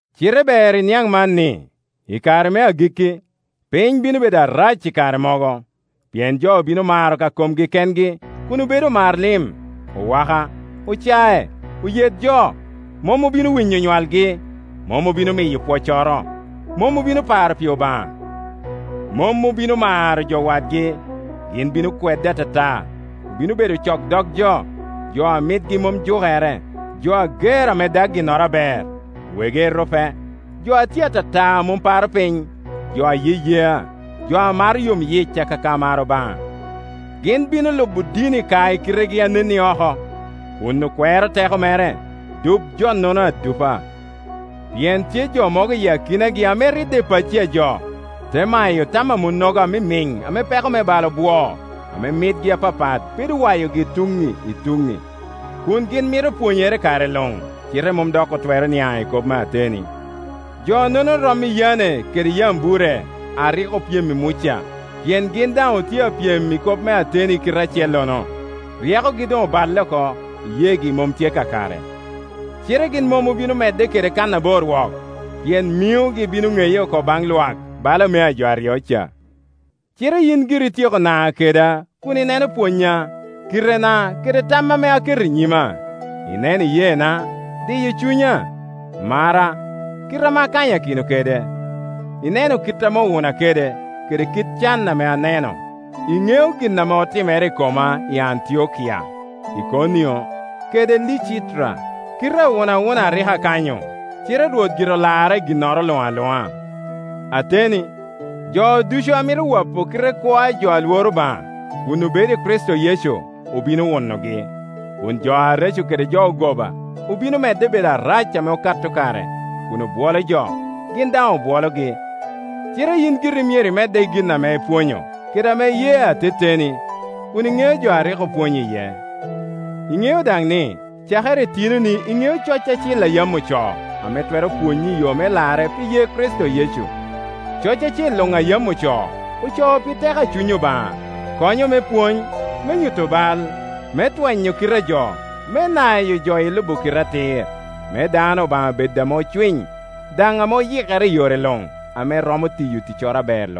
Cite ber iniaŋ man ni, i kare me agikki, piny bino bedo arac i kare mogo. Pien jo bino maro ka komgi kengi, kun obedo omar lim, owaka, ocac, oyet jo. Mom obino winyo onywalgi, mom obino miyo pwoccoro, mom obino paro pi Obaŋa. Mom obino maro jo wadgi; gin bino kwedde atata, obino bedo ocok dog jo, jo a mitgi mom jukere, jo ager ame dag ginnoro aber, wegi erupe, jo a tye atata a mom paro piny, jo a yeyea, jo a maro yomyic akaka maro Obaŋa. Gin bino lubo dini ka i kitegi a nen i oko, kun okwero teko mere. Dup jo-nono adupa. Pien tye jo mogo i akinagi ame ridde i pacci a jo, te mayo tam a monnogo amimiŋ ame peko me bal obwoo, ame mitgi apapat bedo wayogi tuŋŋi i tuŋŋi, kun gin mito pwonyere i kare luŋ, cite mom dok otwero niaŋ i kop me ateni. Jonono rom i Yane kede Yambure a rik opyem i Muca, pien gin daŋ otye a pyem i kop me ateni i kite acellono; ryekogi doŋ oballe oko, iyeegi mom tye kakare. Cite gin mom obino medde kede kannabor wok, pien miŋogi bino ŋeye oko baŋ Iwak, bala mea jo aryo ca. Cite yin giri ityeko na keda kun ineno pwonnya, kitena kede tam ame aketo i nyima. Ineno iyeena, diyo cunya, marra, kite ame akanyakino kede. Ineno kit ame owuna kede, kede can ame aneno; iŋeo gin ame otimere i koma i Antiokia, i Ikonio, kede Licitra, kile awunawuna a rik akanyo; cite Rwot gire olara i ginnoro luŋ aluŋa. Ateni, jo ducu a mito wopo kite kwo ajo a Iworo Obaŋa, kun obedo i Kricito Yecu, obino wunogi, kun jo areco kede jo ogoba, obino medde bedo arac ame okato kare, kun obwolo jo, gin daŋ obwologi. Cite yin giri myero imedde i gin ame ipwonyo, kede ame iye ateteni, kun iŋeo jo a rik opwonyi iye. Iŋeo daŋ ni; cakere i tinoni iŋeo coc acil a yam ocoo, ame twero pwonyi i yo me larre pi ye Kricito Yecu. Coc acil luŋ a yam ocoo, ocoo pi teko a Cuny Obaŋa. Konyo me pwony, me nyuto bal, me twenyo kite a jo, me nayo jo i lubo kite atir, me dano Obaŋa bed ame ocwiny, daŋ ame oyikere i yore luŋ, ame romo tiyo ticcoro aber